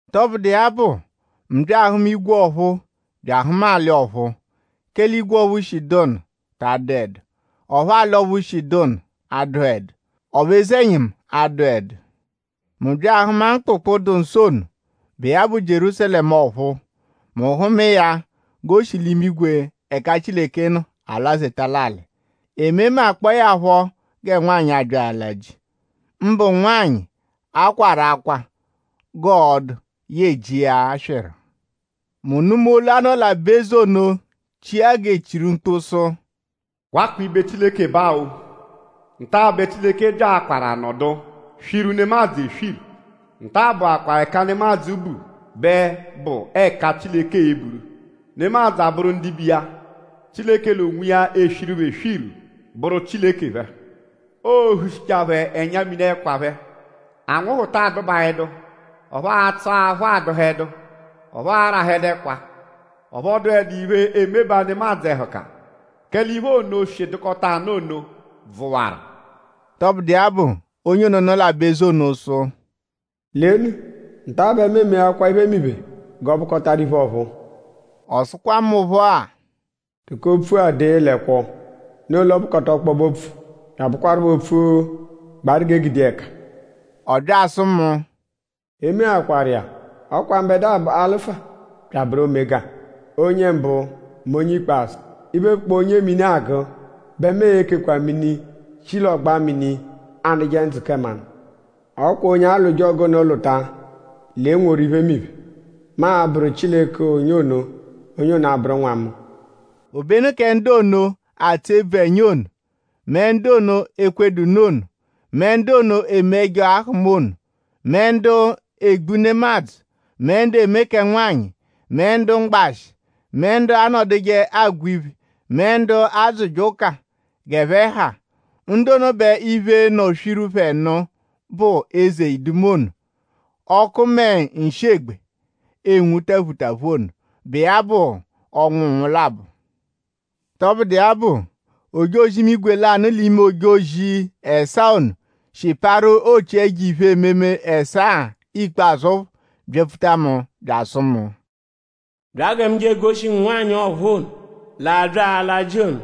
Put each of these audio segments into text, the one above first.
Tọbudu iya bụ; mu bya ahụma igwe ọ̀phúú bya ahụma alị ọ̀phúú; kẹle igwe ọphu shi dụ nụ ta adụedu; ọphu alị ọphu shi dụ nụ adụhedu. Ọphu eze-ẹnyimu adụedu. Mu bya ahụma mkpụkpu, dụ nsọ ono, bụ iya bụ Jierúsalẹmu ọ̀phúú. Mu hụma iya g'o shi l'imigwe ẹka Chileke nọ alwazeta l'alị. E memakpọe ya phọ gẹ nwanyị, abya ala ji; mbụ nwanyị, a kwawaru akwa g'ọo-dụ yẹe ji iya aswịru. Mu nụma olu, a nọ l'aba-eze ono chia g'e chiru mkpu sụ: “Wakwa ibe Chileke ba-o! Nta-a bẹ Chileke byaakwaru anọdu swiru nemadzụ eswiru. Nta-a bụakwaa ẹka nemadzụ bu bẹ bụ ẹka Chileke e-buru; nemadzụ abụru ndibe iya. Chileke l'onwiya eswiru phẹ eswiru; bụru Chileke phẹ. Oo-hushichaa phẹ ẹnya-mini ẹkwa phẹ. Anwụhu ta adụbaedu; ọphu atsụ aphụ a-dụhedu; ọphu aarahẹdu ẹkwa; ọphu ọ dụedu iphe emebaa nemadzụ ẹhuka; kẹle iphe ono, shi dụkota nụ ono bvụwaru.” Tọbudu iya bụ; onye ono, nọ l'aba-eze ono sụ: “Lenu; nta-a bẹ mu emeakwaa iphemiphe g'ọ bụkotaru iphe ọ̀phúú.” Ọ sụkwa mu phọ-a: “Tụko opfu-a dee l'ẹkwo; noo l'ọ bụkota ọkpobe-opfu bya abụkwarupho opfu, gbaru g'e gude iya ẹka.” Ọ bya asụ mu: “E meakwaru iya! Ọ kwa mbẹdua bụ Alụfa bya abụru Omega; Onye mbụ mẹ Onye ikpazụ. Iphe, bụkpoo onye mini agụ bẹ mu e-kekwa mini shi l'ọgba mini anụje ndzụ kẹ mmanụ. Ọ kwa onye alwụje ọgu ono lwụta l'e-nworu iphemiphe. Mu abụru Chileke onye ono; onye ono abụru nwa mu.” Obenu kẹ ndu ono, atsụ ebvu ẹnya ono; mẹ ndu ono, ekwedu nụ ono; mẹ ndu ono eme ẹjo ahụma ono; mẹ ndu egbu nemadzụ; mẹ ndu eme kẹ nwanyị; mẹ ndu mgbashị; mẹ ndu anọduje agwa iphe; mẹ ndu adzụje ụka g'ẹphe ha; ndu ono bẹ iphe nọ swiru phẹ nụ bụ eze iduma ono, ọku mẹ nshị-egbe enwu taphutaphu ono, bụ iya bụ ọnwu nnwụ labọ. Tọbudu iya bụ; ojozi-imigwe lanụ l'ime ojozi ẹsaa ono, shi parụ ochi ẹjo iphe-ememe ẹsaa ikpazụ phọ byapfuta mu bya asụ mu: “Bya gẹ mu je egoshi ngu nwanyị ọ̀phúú ono, l'abya ala ji ono,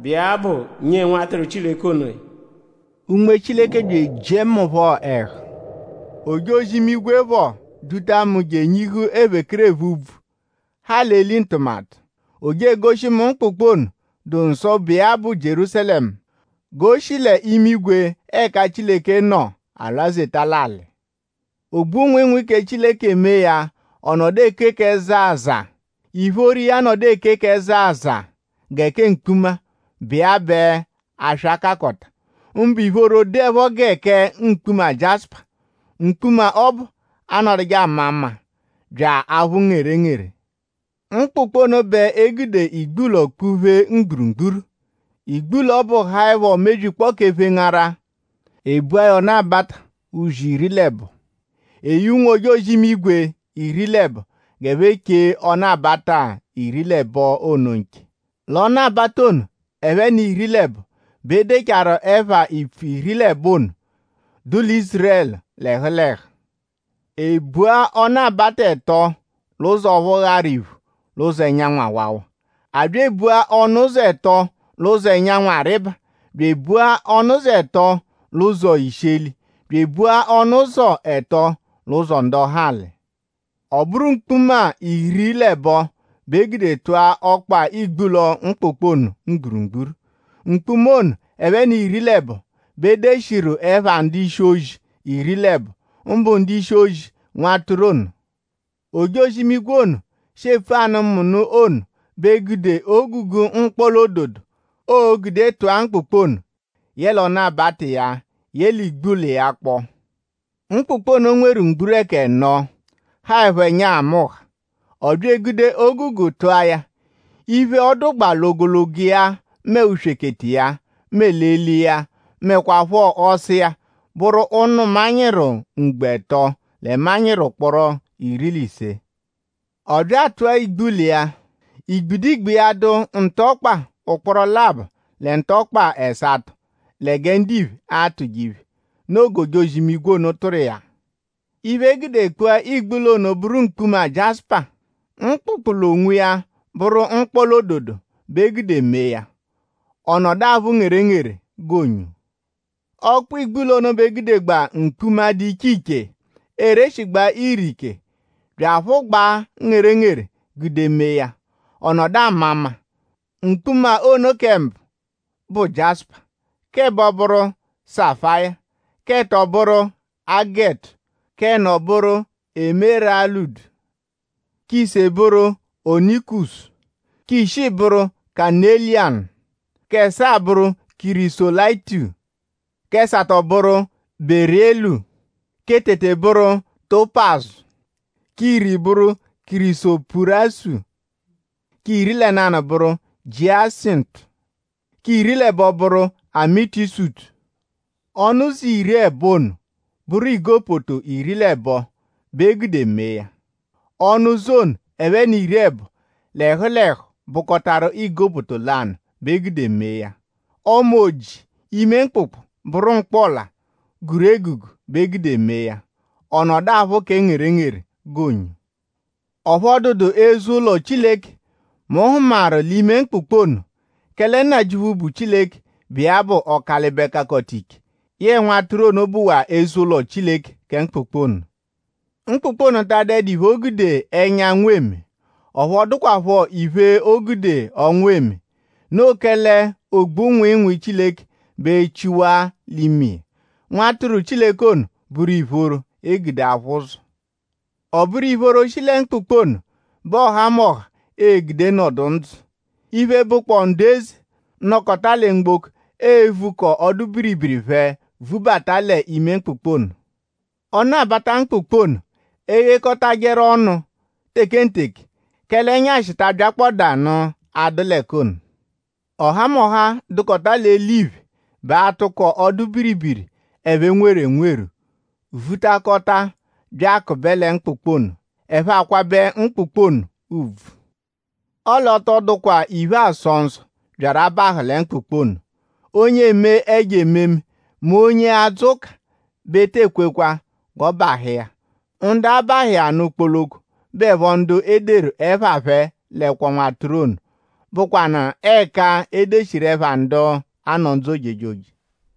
bụ iya bụ nyee Nwatụru Chileke onoya.” Unme Chileke bya ejiẹ mu phọ ẹhu. Ojozi-imigwe phọ duta mu je enyihu ephekerephe úbvú, ha l'eli ntụmatu. O je egoshi mu mkpụkpu ono, dụ nsọ, bụ iya bụ Jierúsalẹmu g'o shi l'imigwe ẹka Chileke nọ alwazeta l'alị. Ogbu-nwịinwii kẹ Chileke mee ya ọ nọdu eke kẹ zaa zaa. Ìphóró iya nọdu eke zaa zaa gẹ kẹ mkpuma, bụ iya bẹ aswa kakọta; mbụ ìphóró dụepho gẹ kẹ mkpuma jiásùpà. Mkpuma ọbu anọduje ama mma; bya aphụ ngerengere. Mkpụkpu ono bẹ e gude igbulọ kpụ-pheta mgburugburu. Igbulọ ọbu haẹpho mebyikpọo kẹ phengara. E bua ya ọnu-abata uzi iri l'ẹbo. E ye ụnwu-ojozi-imigwe iri l'ẹbo g'ẹphe cheje ọnu-abata iri l'ẹbo ono nche. L'ọnu-abata ono ẹphe n'iri l'ẹbo bẹ e degbachaaru ẹpha ipfu iri l'ẹbo ono, dụ lẹ Ízurẹlu l'ẹhu l'ẹhu. E bua ọnu-abata ẹto l'ụzo ọphu gharu iphu l'ụzo ẹnyanwu awawa; a bya ebua ọnu-ụzo ẹto l'ụzo ẹnyanwu arịba; bya ebua ọnu-ụzo ẹto l'ụzo isheli; bya ebua ọnu-ụzo ẹto l'ụzo ndọhali. Ọ bụru mkpuma iri l'ẹbo bẹ e gude tụa ọkpa igbulọ mkpụkpu ono mgburugburu. Mkpuma ono ẹphe n'iri l'ẹbo bẹ e deshiru ẹpha ndu-ishi-ozi iri l'ẹbo; mbụ ndu-ishi-ozi Nwatụru ono. Ojozi-imigwe ono, shi epfu anụ mu nụ ono bẹ gude ogugu mkpọla-ododo, oo-gude tụ̀á mkpụkpu ono yẹle ọnu-abata iya yẹle igbulọ iya kpọo. Mkpụkpu ono nweru mgburẹku ẹno, haẹpho ẹnya nhamụnha. Ọ bya egude ogugu tụ̀á ya. Iphe, ọ dụgbaa l'ogologo iya mẹ uswekete iya mẹ eli iya mẹkwapho ọsa iya bụru ụnu manyịru ugbo ẹto lẹ manyịru ụkporo iri l'ise. Ọ bya atụ̀a igbulọ iya; igbidigbi iya dụ ntụ ọkpa ụkporo labọ lẹ ntụ ọkpa ẹsato lẹ gẹ ndiphe atụje iphe. Noo g'ojozi-imigwe ono tụru iya. Iphe, e gude kpụa igbulọ ono bụru mkpuma jiásùpà. Mkpụkpu l'onwiya bụru mkpọla-ododo bẹ e gude mee ya. Ọ nọdu aphụ ngerengere g'onyo. Ọkpa igbulọ ono bẹ e gudegbaa mkpuma, dụ iche iche, ereshigbaa ire ike bya aphụgbaa ngerengere gude mee ya; ọ nọdu ama mma. Mkpuma ono kẹ mbụ bụ jiásùpà; k'ẹbo bụru sáfàyà; k'ẹto bụru ágètù; k'ẹno bụru émèràlụ̀dú; k'ise bụru ónìkùsù; k'ishii bụru kanélìyànù; k'ẹsaa bụru kìrísòlàyìtù; k'ẹsato bụru bérìlù; kẹ tete bụru tópàzù; k'iri bụru kìrísòpùràsù; k'iri lẹ nanụ bụru jiásìntù; k'iri l'ẹbo bụru ámìtìsùtù. Ọnu-ụzo iri l'ẹbo ono bụru igopoto iri l'ẹbo bẹ e gude mee ya. Ọnu-ụzo ono ẹphe n'iri l'ẹbo l'ẹhu l'ẹhu bụkotaru igopoto lanụ bẹ e gude mee ya. Ọma oji ime mkpụkpu bụru mkpọla, guru egugu bẹ e gude mee ya. Ọ nọdu aphụ kẹ ngerengere g'onyo. Ọphu ọ dụdu eze-ụlo Chileke, mu hụmaru l'ime mkpụkpu ono; kẹle Nnajịuphu bụ Chileke, bụ iya bụ Ọkalibe-Kakọta-Ike yẹe Nwatụru ono bụwaa eze-ụlo Chileke kẹ mkpụkpu ono. Mkpụkpu ono ta adụedu iphe, o gude ẹnyanwu eme; ọphu ọ dụkwapho iphe, o gude ọnwa eme. Noo kẹle ogbu-nwịinwii Chileke bẹ echiwa l'ime iya. Nwatụru Chileke ono bụru ìphóró, e gude aphụ ụzo. Ọ bụru ìphóró, shi lẹ mkpụkpu ono bẹ ọhamoha e-gude nọdu ndzụ. Iphe, bụkpoo ndu eze, nọkota lẹ mgboko evukọo ọdu-biribiri phẹ vubata l'ime mkpụkpu ono. Ọnu-abata mkpụkpu ono e-ghekọtajeru ọnu tekenteke; kẹle ẹnyashi ta abyakpọdaanu adụ l'ẹka ono. Ọhamoha, dụ l'eliphe bẹ a-tụko ọdu-biribiri, ẹphe nweru enweru vutakọta bya akụbe lẹ mkpụkpu ono; ẹphe akwabẹ mkpụkpu ono ùbvù. Ọle ọ tọ dụkwanu iphe, aasọ nsọ, byaru abahụ lẹ mkpụkpu ono. Onye eme ẹjo ememe m'onye adzụ ụka bẹ e te ekwekwa g'ọ bahụ iya. Ndu a-bahụ iya nụ kpoloko bụepho ndu e deru ẹpha phẹ l'ẹkwo Nwatụru ono, bụkwanu ẹka e deshiru ẹpha ndu a-nọ ndzụ ojejoje.